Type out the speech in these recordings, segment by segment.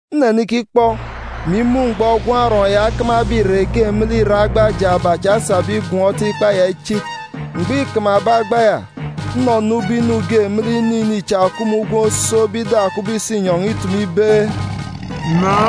Nnenikikpọ, mè imun̄ mgbọ Gwun̄ Arọọn̄ ya okamabe adasi irek me lek irek agba jaaba cha esabe igọm ikpa ya ichit. Mgbọ îkamabe agba ya, nnọnọ ubọk inu ge me lek inu ini cha òkup me ugwem osookbe ida kubọk isinyọn̄ itumu ibe, “Na!”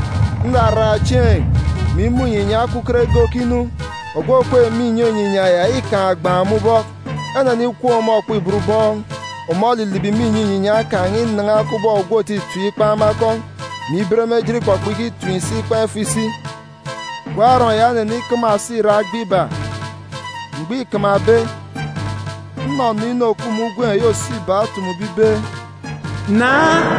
Nraraan̄ chieen̄, mè imun̄ inyinya okuket ge okinu. Ogwu òkweek me inyọn̄ inyinya ya îkaan̄ ogbaan̄ me ubọk. Enenikwuun̄ ọmọ okpibot ubọọn̄. Ọmọ olilibi me inyọn̄ inyinya kan̄ inan̄a kubọk ogwu òtitim ikpan̄ me akọn̄, mè iben me ejit ikpọkpọ ikitim si ikpan̄ ifo isi. Gwun̄ Arọọn̄ ya onenikama òso irek agba iba. Mgbọ îkamabe, nnọnọ inu òkup me ugwem eyi òso iba otumube ibe, “Na!”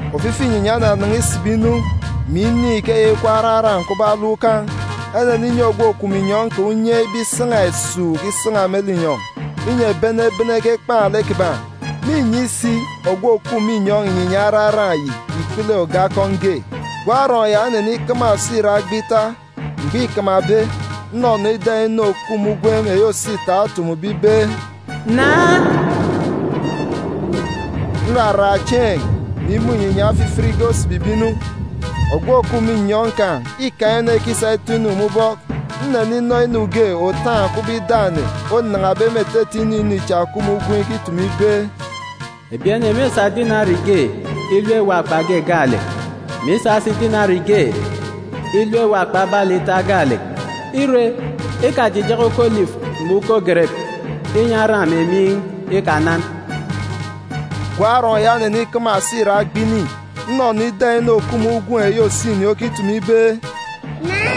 Ofifi inyinya onanan̄a isibi inu, mè inin̄ ikeya ikup araran̄ kubọk alọm ukan̄. Eneninyi ogwu òkup me inyọn̄ kan̄ unye ibe isan̄a esuuk isan̄a me linyọn̄, inyi ebi ene ebene ekekpan̄ lek kiban̄. Mînyi si ogwu òkup me inyọn̄ inyinya araran̄ yi ikpele oge akọn̄ ge. Gwun̄ Arọọn̄ ya onenikama òso irek agba ita. Mgbọ îkamabe, nnọnọ ida inu òkup me ugwem eyi òso ita otumube ibe, “Na!” Nraraan̄ chieen̄, mè imun̄ inyinya ofifit ge osibibe inu. Ogwu òkup me inyọn̄ kan̄ îkaan̄ okwukwut itọ-inu me ubọk. Nneninọ inu ge òtaan̄ kubọk ida ene onan̄abe me etete inu ini cha òkup me ugwem ikitumu ibe, “Ebi ene mêsa dinari ge ilep ewopa akpa wit ge gaalek, mè isa si dinarib ge ilep ewop akpa balì ita gaalek. Ire, ikajijaka uko olifu mè uko gerep, inyi aran̄ mè miin̄ ikanan.” Gwun̄ Arọọn̄ ya onenikama òso irek agba ini. Nnọnọ ida inu òkup me ugwem eyi òso ini okitumu ibe, “Na!”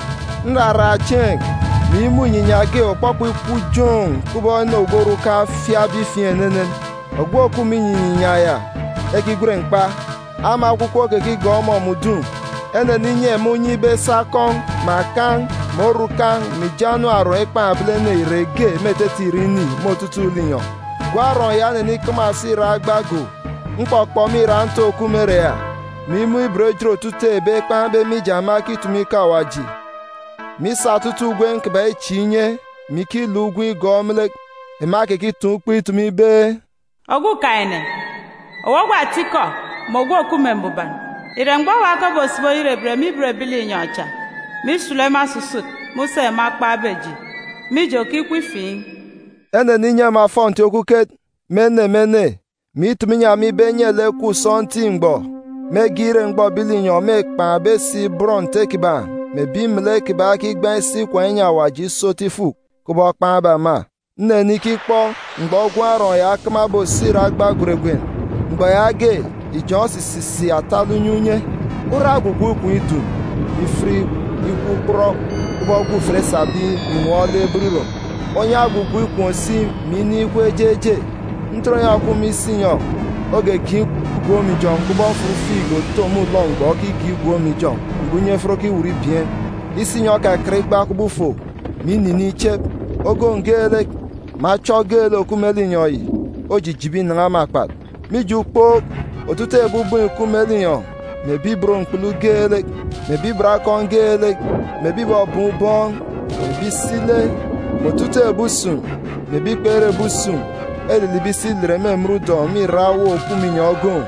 Nraraan̄ chieen̄, mè imun̄ inyinya ge òkpọkpọ ikup joon̄ kubọk ene ogwu orukan̄ ofiakbe ifiin̄ enenen. Ogwu òkup me inyọn̄ inyinya ya, ekigwen Mkpa. Ama Ekwukwu okekigọọk ọmọ me udun̄. Eneninyi ema unye ibe esa oge akọn̄, mè akan̄, mè orukan̄, mè ijo anam oron ekpan̄ ebilene, irek ge me etete irek ini, me otutuuk linyọn̄. Gwun̄ Arọọn̄ ya onenikama òso irek agba go. Mkpọkpọ me irak ntook òkup me ere ya, mè imun̄ ibot ejit otutuuk ebi ekpan̄be mije ema ekitumu ikọ Awaji, mè isa otutuuk ugwem kiban̄ ichieek inye, mè ikiluk ugwem igọọk me lek. Ema ekekitaan̄ ukpo itumu ibe, “Ogwukaan̄-ene, owu ogwu atikọ, mè ogwu òkup me mbuban, ìre mgbọ owa ke obosibi oyerebet me ibot ebi linyọn̄ cha, mè isulu ema osusut me useen̄ ema ekpan̄be eji? Mije, òkikup ifiin̄.” Eneninyi ema ofọnti okuket, me ene me ene, mè itumu inyi ema ibe enye lek ekup sọntiik mgbọ, mege ire mgbọ ebi linyọn̄ mêkpan̄be si bọn Nte kiban̄ mè ebi melek kiban̄ ekigbaan̄ isi ikwaan̄ inyi Awaji iso otu ifuk, kubọk ekpan̄be ema. Nnenikikpọ mgbọ Gwun̄ Arọọn̄ ya okamabe òso irek agba gweregwen. Mgbọ yaage, ijọn̄ osisisik atalek unye unye, ura ogwugwu ikom idun, mè ifit ikup kpurọk kubọk ekwut ufieejit esabe inwọọn̄ ebot irom. Onyan̄ ogwugwu ikom si, mè inin̄ ikup eje eje. Ntoronyan̄ òkup me isinyọn̄ ogegen̄ igwook me ijọn̄ kubọk mfut figi òto me ulọ mgbọ okigen̄ igwook me ijọn̄ mgbọ unye efet okiwut ibieen̄. Isinyọn̄ okakat igba kubọk ufo, mè ininiin̄ ichep. Ogoon̄ geelek, mè achọ geelek òkup me linyọn̄ yi, ojijibi inan̄a me akpat. Mije ukpook, otutuuk ebi ubọọn̄ ìkup me linyọn̄, mè ebi ibot mkpulu geelek, mè ebi ibot akọn̄ geelek, mè ebi ìbọbọọn̄ ubọọn̄, mè ebi isi ile, mè otutuuk ebi usun̄, mè ebi kpere ebi usun̄, elilibi isi ilet me emen ǹkororok mè irak ewuuk òkup me inyọn̄ ogoon̄,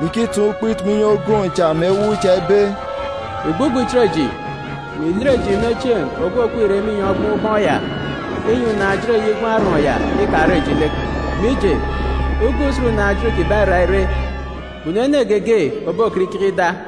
mè ikitaan̄ ukpo itumu inyi ogoon̄ cha mè ewuuk cha ibe, “Ìgbugbọ ìchit eji, mè ìlet eji me chieen̄ ogwu òkweek irek me inyọn̄ ogboon̄ ubọọn̄ ya, inyi unaan̄-ejit eyi Gwun̄ Arọọn̄ ya ikare eji lek! Mije, uga usen unaan̄-ejit kiban̄ îra ire. Kpunu ene geege òbokọt ikeke ida!”